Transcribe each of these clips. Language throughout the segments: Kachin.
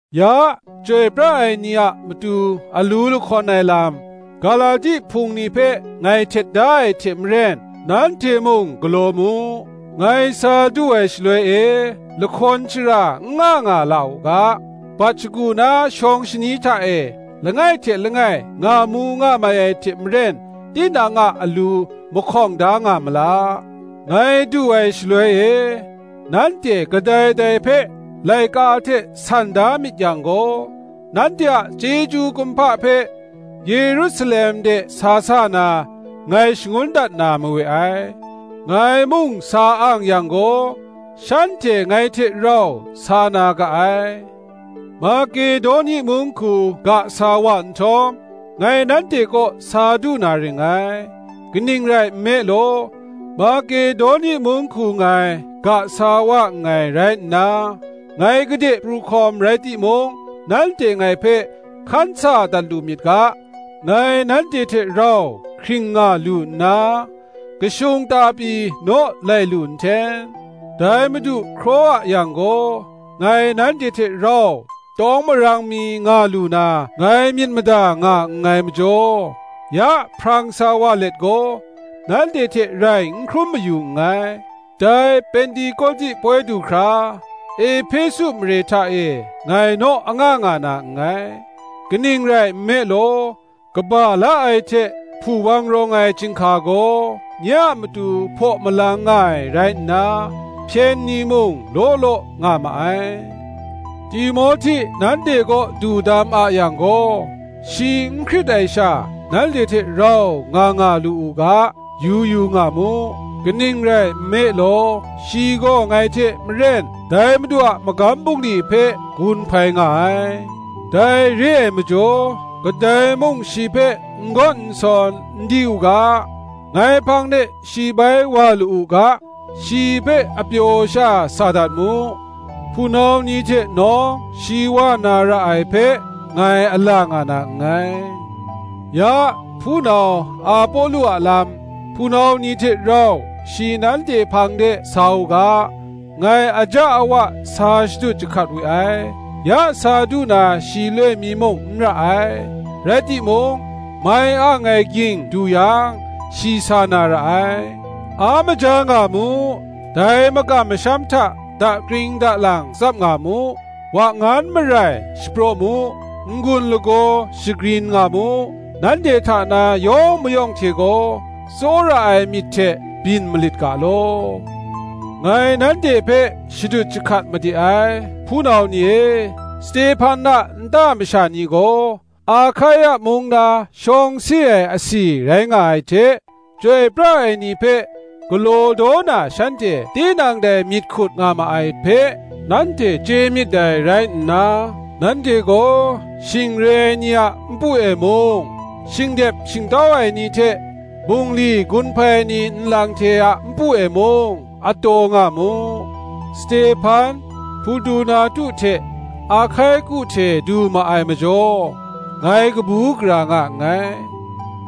Ya, chyoi pra ai ni a matu alu lahkawn ai lam, Galati hpung ni hpe ngai htet da ai hte maren, nanhte mung galaw mu. Ngai sa du ai shaloi e lahkawn shara n nga nga la u ga, bat shagu na shawng shani hta e, langai hte langai ngamu ngamai ai hte maren, tinang a alu mahkawng da nga ma la. Ngai du ai shaloi e, nanhte kadai dai hpe laika hte san da myit yang gaw, nanhte a chyeju kumhpa hpe Yerusalem de sa sa na, ngai shangun dat na mawe ai. Ngai mung sa ang yang gaw, shanhte ngai hte rau sa na ga ai. Makedoni mung hku ga sa wa nhtawm, ngai nanhte kaw sa du na ring ngai; kaning rai nme law, Makedoni mung hku ngai ga sa wa nngai rai nna, ngai gade pru hkawm rai timung, nanhte ngai hpe hkan sa dat lu myit ga, ngai nanhte hte rau hkring nga lu nna, kashung ta pyi naw lai lu nhten. Dai Madu hkraw a yang gaw ngai nanhte hte rau tawng marang mi nga lu na, ngai myit mada nga nngai majaw, ya hprang sa wa let gaw, nanhte hte rai n hkrum mayu nngai. Dai Pentekoti poi du hkra, Ehpesu mare hta e ngai naw anga nga na nngai. Kaning rai nme law, kaba la ai hte hpuwang rawng ai chyinghka gaw nye a matu hpaw malang nga ai rai nna, hpyen ni mung law law nga ma ai. Timohti nanhte kaw du dam a yang gaw, shi n hkrit ai sha nanhte hte rau nga nga lu u ga, yu yu nga mu; kaning rai nme law, shi gaw ngai hte maren dai Madu a magam bungli hpe gun hpai nga ai. Dai re ai majaw kadai mung shi hpe n gawn n sawn, n di u ga. Ngai hpang de shi bai wa lu u ga, shi hpe apyaw sha sa dat mu; hpunau ni hte nawng shi wa na ra ai hpe, ngai ala nga na nngai. Ya, hpunau Apolo a lam, hpunau ni hte rau shi nanhte hpang de sa u ga, ngai aja awa sa shadut jahkat we ai: ya sa du na shi loi mi muk n ra ai, rai timung, mai ang ai gying du yang, shi sa na ra ai. A maja nga mu, dai makam masham hta dakring dalang tsap nga mu, wa-ngan marai shapraw mu, n-gun lagaw shagrin nga mu. Nanhte hta na yawng mayawng hte gaw, tsawra ai myit hte byin malit ga law. Ngai nanhte hpe shadut jahkat made ai, hpunau ni e; Stehpan a nta masha ni gaw, Ahkaia mung na shawng si ai asi rai nga ai hte, chyoi pra ai ni hpe galaw daw na shanhte tinang dai myit hkut nga ma ai hpe, nanhte chye myit dai rai nna, nanhte gaw shing re ai ni a npu e mung, shingdep shingtau ai ni hte, bungli gun hpai ai ni nlang hte a npu e mung, a taw nga mu. Stehpan, Hportunatu hte Ahkaiku hte du ma ai majaw, ngai kabu gara nga nngai;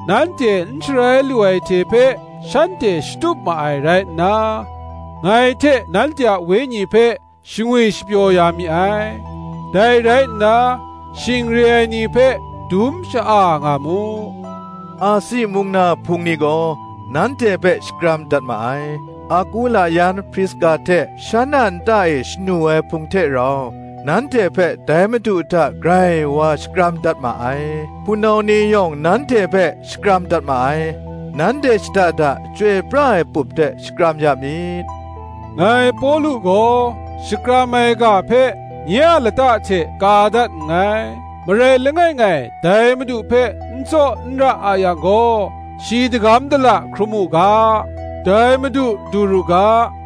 nanhte n sharai lu ai hte hpe shanhte shatup ma rai rai nna, ngai hte nanhte a wenyi hpe shangwi shapyaw ya mi ai. Dai rai nna shing re ai ni hpe dum sha-a nga mu. Asi mung na Hpung ni gaw nanhte hpe shakram dat ma ai. Akula yan Priska hte shan a nta e shanu ai Hpung hte rau, nanhte hpe dai Madu hta grai wa shakram dat ma ai. Hpunau ni yawng nanhte hpe shakram dat ma ai. Nanhte shada da chyoi pra ai pup hte shakram ya mi. Ngai Pawlu gaw shakram ai ga hpe nye a lata hte ka dat nngai. Marai langai ngai dai Madu hpe n tsaw n ra a yang gaw shi dagam dala hkrum u ga. Dai Madu du ru ga.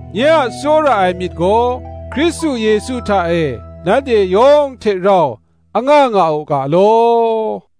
Nye a tsawra ai myit gaw, Hkristu Yesu hta e nanhte yawng hte rau anga nga u ga law.